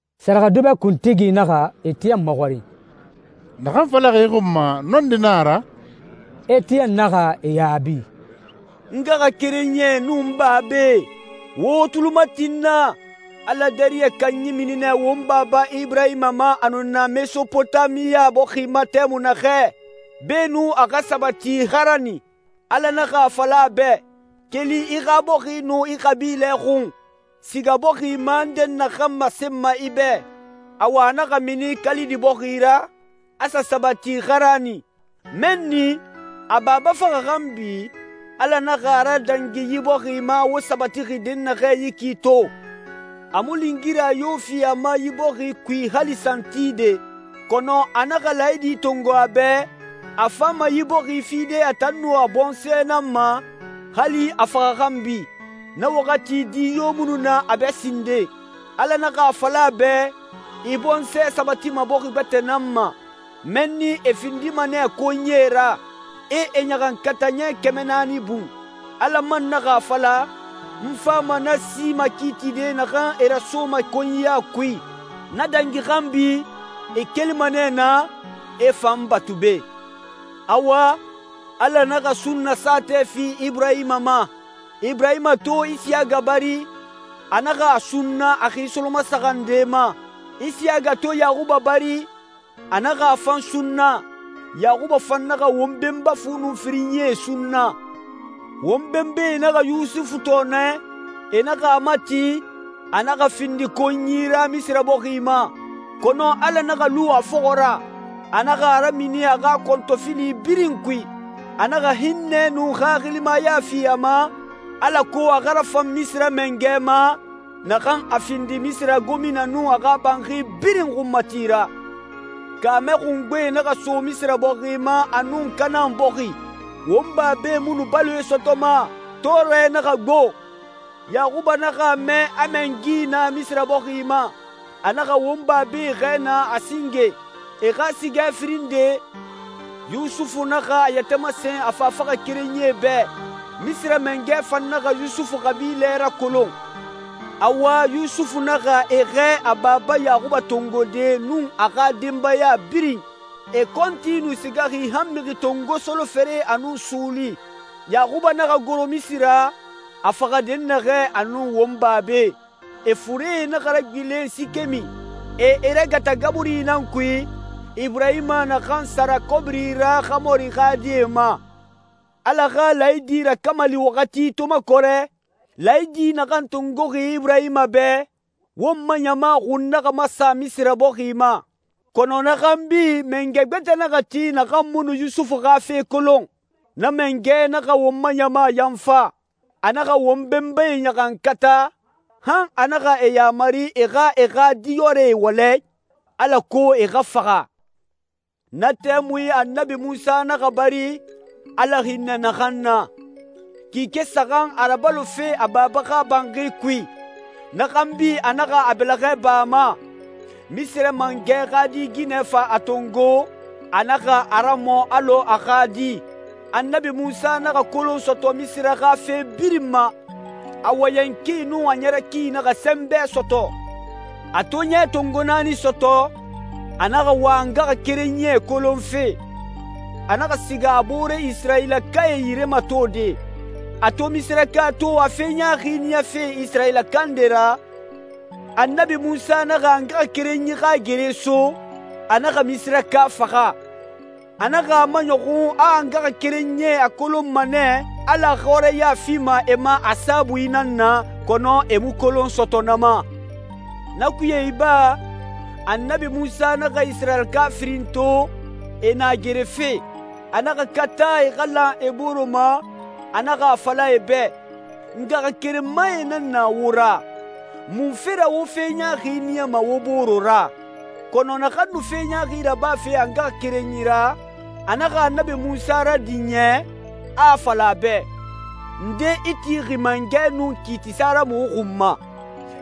Sɛrɛxɛdubɛ kuntigi naxa Etiyɛn maxɔrin, «Naxan falaxi i xun ma, nɔndi na a ra?» Etiyɛn naxa e yaabi, «N ngaxakerenyie nun n babae, wo wo tuli mati n na. Ala dariyɛ kanyi mini nɛ won baba Iburahima ma a nu na Mesopotamiya bɔxi ma tɛmui naxɛ, beenun a xa sabati Xarani. Ala naxa a fala a bɛ, ‹Keli i xa bɔxi nun i xabilɛ xun, siga bɔxi ma n dɛnnaxɛ masenma i bɛ.› Awa, a naxa mini Kalidi bɔxi ra, a sa sabati Xarani. Mɛnni, a baba faxa xanbi, Ala naxa a radangi yi bɔxi ma wo sabatixi dɛnnaxɛ yi ki to. A mu lingira yo fi a ma yi bɔxi kui hali santide. Kɔnɔ a naxa laayidi tongo a bɛ, a fama yi bɔxi fide a tan nun a bɔnsɔɛ nan ma, hali a faxa xanbi. Na waxati di yo mu nu na a bɛ sinden.» «Ala naxa a fala a bɛ, ‹I bɔnsɔɛ sabatima bɔxi gbɛtɛ nan ma. Mɛnni e findima nɛ konyie ra. E e ɲaxankata ɲɛ kɛmɛ naani bun.› Ala man naxa a fala, ‹N fama na si makiitide naxan e rasoma konyiya kui. Na dangi xanbi, e kelima nɛ naa, e fa n batu be.›» «Awa, Ala naxa sunna saatɛ fi Iburahima ma. Iburahima to Isiyaga bari, a naxa a sunna a xi solomasaxan nde ma. Isiyaga to Yaxuba bari, a naxa a fan sunna. Yaxuba fan naxa won benba fu nun firinyie sunna.» «Won benbae naxa Yusufu tɔɔnɛ, e naxa a mati, a naxa findi konyi ra Misira bɔxi ma. Kɔnɔ Ala naxa lu a fɔxɔ ra. A naxa a ramini a xa kɔntɔfili birin kui. A naxa hinnɛ nun xaxilimaya fi a ma, alako a xa rafan Misira mangɛ ma, naxan a findi Misira gomina nun a xa banxi birin xunmati ra.» «Kaamɛ xungbe naxa so Misira bɔxi ma a nun Kanaan bɔxi. Won babae mu nu baloe sɔtɔma, tɔɔrɛ naxa gbo. Yaxuba naxa a mɛ a mɛngi na Misira bɔxi ma. A naxa won babae xɛɛ naa a singe. E xa sigɛ firin nde, Yusufu naxa a yɛtɛ masen a fafaxakerenyie bɛ, Misira mangɛ fan naxa Yusufu xabilɛ rakolon. Awa, Yusufu naxa e xɛɛ a baba Yaxuba tongode nun a xa denbaya birin. E kɔnti nu sigaxi han mixi tongo solofere a nun suuli. Yaxuba naxa goro Misira, a faxa dɛnnaxɛ a nun won babae. E furee naxa ragbilen Sikemi, e e ragata gaburi nan kui, Iburahima naxan sara kɔbiri ra Xamori xa die ma.» «Ala xa laayidi rakamali waxati to makɔrɛ, laayidi naxan tongoxi Iburahima bɛ, won ma ɲama xun naxa masa Misira bɔxi ma. Kɔnɔ na xanbi mangɛ gbɛtɛ naxa ti naxan mu nu Yusufu xa fe kolon. Na mangɛ naxa won ma ɲama yanfa. A naxa won benbae ɲaxankata, han a naxa e yaamari e xa e xa diyɔrɛe wɔlɛ, alako e xa faxa. Na tɛmui Annabi Munsa naxa bari, Ala hinnɛ naxan na. Kike saxan a rabalofe a baba xa banxi kui. Na xanbi a naxa a bɛlɛxɛ ba a ma. Misira mangɛ xa di ginɛ fa a tongo, a naxa a ramɔ alɔ a xa di. Annabi Munsa naxa kolon sɔtɔ Misira xa fe birin ma. A wɔyɛn ki nun a ɲɛrɛ ki naxa sɛnbɛ sɔtɔ.» «A to ɲɛ tongo naani sɔtɔ, a naxa wa a ngaxakerenyie kolonfe. A naxa siga a boore Isirayilakae yire matode. A to Misiraka to a fe ɲaaxi niyafe Isirayilaka nde ra, Annabi Munsa naxa a ngaxakerenyi xa gere so, a naxa Misiraka faxa. A naxa a maɲɔxun a a ngaxakerenyie a kolonma nɛ Ala xɔrɛya fima e ma a saabui nan na, kɔnɔ e mu kolon sɔtɔ na ma. Na kuye iba, Annabi Munsa naxa Isirayilaka firin to, e na gerefe. A naxa kata e xa lan e bore ma, a naxa a fala e bɛ, ‹Ngaxakerenmae nan na wo ra. Munfe ra wo fe ɲaaxi niyama wo bore ra?› Kɔnɔ naxan nu fe ɲaaxi rabafe a ngaxakerenyi ra, a naxa Annabi Munsa radin yɛ, a a fala a bɛ, ‹Nde i tixi mangɛ nun kiitisa ra muxu xun ma?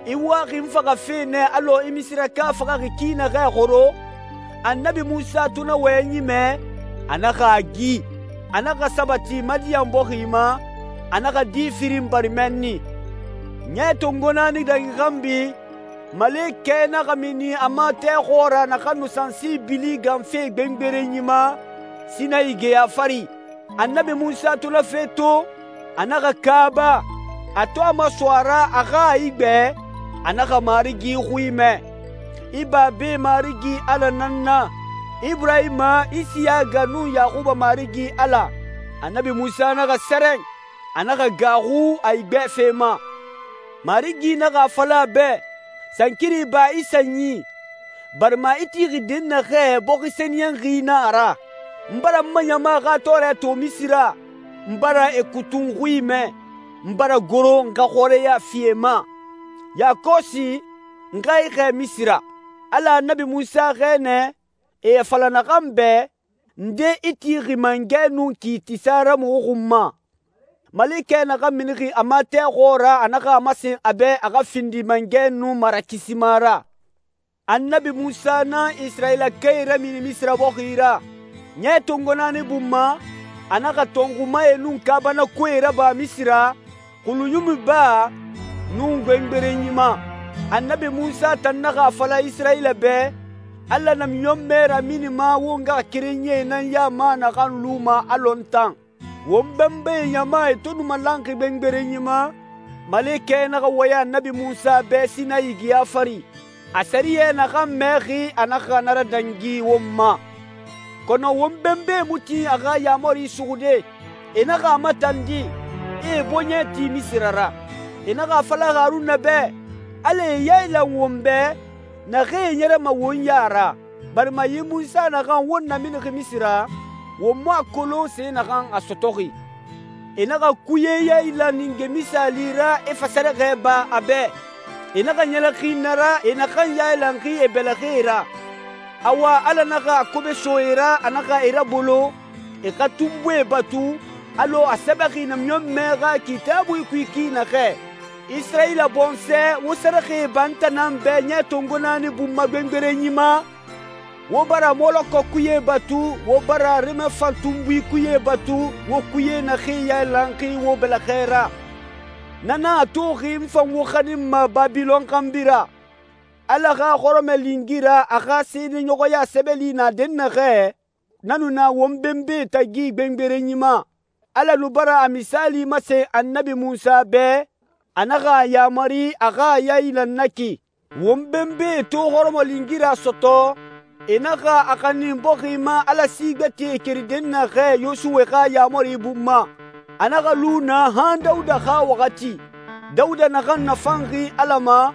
I waxi n faxafe nɛ alɔ i Misiraka faxaxi ki naxɛ xoro?› Annabi Munsa to na wɔyɛnyi mɛ, a naxa a gi. A naxa sabati Madiyan bɔxi ma, a naxa di firin bari mɛnni.» «Ɲɛ tongo naani dangi xanbi, malekɛ naxa mini a ma tɛ xɔɔra naxan nu sansi bili ganfe gbengberenyi ma, Sinayi geya fari. Annabi Munsa to na fe to, a naxa kaaba. A to a maso a ra, a xa a igbɛ, a naxa Marigi xui mɛ. ‹I babae Marigi Ala nan n na, Iburahima, Isiyaga, nun Yaxuba Marigi Ala.› Annabi Munsa naxa sɛrɛn, a naxa gaaxu a igbɛfe ma. Marigi naxa a fala a bɛ, ‹Sankiri ba i sanyi, barima i tixi dɛnnaxɛ, bɔxi sɛniyɛnxi na a ra. N bara n ma ɲama xa tɔɔrɛ to Misira, n bara e kutun xui mɛ. N bara goro n xa xɔrɛya fi e ma. Yakɔsi, n xa i xɛɛ Misira.› Ala Annabi Munsa xɛɛ nɛ, e a fala naxan bɛ, ‹Nde i tixi mangɛ nun kiitisa ra muxu xun ma.› Malekɛ naxan minixi a ma tɛ xɔɔra a naxa a masen a bɛ a xa findi mangɛ nun marakisima ra.» «Annabi Munsa nan Isirayilakae ramini Misira bɔxi ra. Ɲɛ tongo naani bun ma, a naxa tɔnxumae nun kaabanakoee raba Misira, Xulunyumi Baa, nun gbengberenyi ma. Annabi Munsa tan naxa a fala Isirayila bɛ, ‹Ala namiɲɔnmɛ raminima wo ngaxakerenyie nan ya ma naxan luma alɔ n tan.› Won benbae ɲama e to nu malanxi gbengberenyi ma, malekɛ naxa wɔyɛn Annabi Munsa bɛ Sinayi geya fari. A sɛriyɛ naxan mɛxi, a naxa na radangi won ma.» «Kɔnɔ won benbae mu tin a xa yaamari suxude. E naxa a matandi, e e bɔɲɛ ti Misira ra. E naxa a fala Haruna bɛ, ‹Alae yailan won bɛ, naxee ɲɛrɛma won ya ra, barima yi Munsa naxan won naminixi Misira, won mu a kolon se naxan a sɔtɔxi.› E naxa kuye yailan ninge misaali ra, e fa sɛrɛxɛ ba a bɛ. E naxa ɲɛlɛxin na ra, e naxan yailanxi e bɛlɛxɛe ra.» «Awa, Ala naxa a kobe so e ra, a naxa e rabolo, e xa tunbuie batu, alɔ a sɛbɛxi namiɲɔnmɛ xa Kitaabui kui ki naxɛ. ‹Isirayila bɔnsɔɛ, wo sɛrɛxɛe ba n tan nan bɛ ɲɛ tongo naani bun ma gbengberenyi ma? Wo bara Mɔlɔkɔ kuye batu, wo bara Remefan tunbui kuye batu, wo kuye naxee yailanxi wo bɛlɛxɛ ra. Na nan a toxi n fan wo xaninma Babilɔn xanbi ra.›» «Ala xa hɔrɔmɔlingira, a xa seedeɲɔxɔya sɛbɛli na dɛnnaxɛ, na nu na won benbae tagi gbengberenyi ma. Ala nu bara a misaali masen Annabi Munsa bɛ, a naxa a yaamari a xa a yailan na ki. Won benbae to hɔrɔmɔlingira sɔtɔ, e naxa a xanin bɔxi ma Ala si gbɛtɛe keri dɛnnaxɛ, Yosuwe xa yaamari bun ma. A naxa lu naa han Dawuda xa waxati.» «Dawuda naxan nafanxi Ala ma,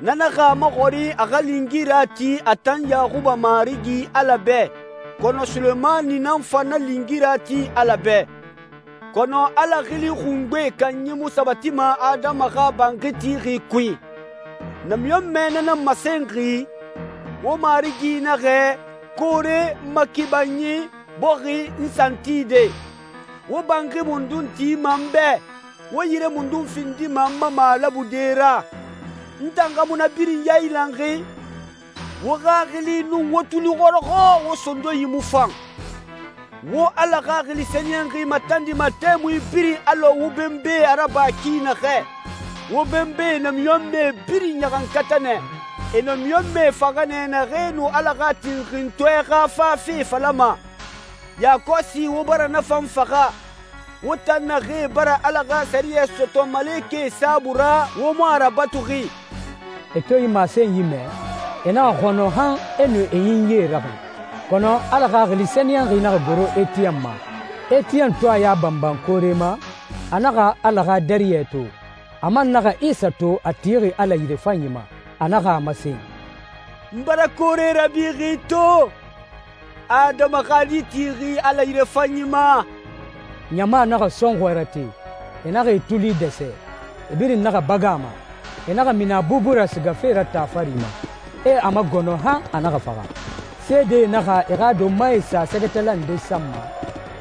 na naxa a maxɔrin a xa lingira ti a tan Yaxuba Marigi Ala bɛ. Kɔnɔ Sulemani nan fa na lingira ti Ala bɛ. Kɔnɔ Ala Xili Xungbe Kanyi mu sabatima adama xa banxi tixi kui. Namiɲɔnmɛ na nan masenxi, ‹Wo Marigi naxɛ, koore, n ma kibanyi, bɔxi, n santide. Wo banxi mundun tima n bɛ? Wo yire mundun findima n ma malabude ra? N tan xa mu na birin yailanxi?›» «Wo xaxili nun wo tuli xɔrɔxɔ, wo sondonyi mu fan. Wo Ala Xaxili Sɛniyɛnxi matandima tɛmui birin alɔ wo benbae a raba ki naxɛ. Wo benbae namiɲɔnmɛe birin ɲaxankata nɛ. E namiɲɔnmɛe faxa nɛ, naxee nu Ala xa Tinxintɔɛ xa fafe falama. Yakɔsi wo bara na fan faxa. Wo tan naxee bara Ala xa sɛriyɛ sɔtɔ malekɛe saabui ra, wo mu a rabatuxi!» E to yi masenyi mɛ, e naxa xɔnɔ han e nu e ɲinyie raxin. Kɔnɔ Ala Xaxili Sɛniyɛnxi naxa goro Etiyɛn ma. Etiyɛn to a ya banban koore ma, a naxa Ala xa dariyɛ to, a man naxa Isa to a tixi Ala yirefanyi ma. A naxa a masen, «N bara koore rabixi to, Adama xa Di tixi Ala yirefanyi ma.» Ɲama naxa sɔnxɔɛ rate, e naxa e tuli dɛsɛ. E birin naxa bagan a ma. E naxa mini a bubu ra sigafe ra taa fari ma, e a magɔnɔ han a naxa faxa. Seedee naxa e xa donmae sa sɛgɛtala nde san ma,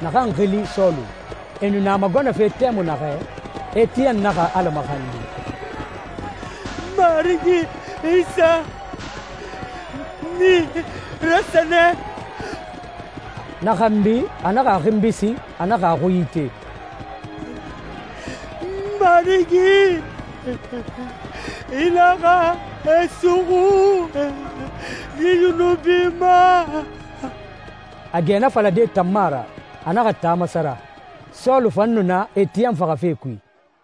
naxan xili Sɔlu. E nu na a magɔnɔfe tɛmui naxɛ, Etiyɛn naxa Ala maxandi, «N Marigi Isa, n nii rasɛnɛ.» Na xanbi a naxa a xinbi sin, a naxa a xui ite, «N Marigi, i naxa e suxu yi yunubi ma!» A gɛ na falade tan mu a ra, a naxa taa masara. Sɔlu fan nu na Etiyɛn faxafe kui.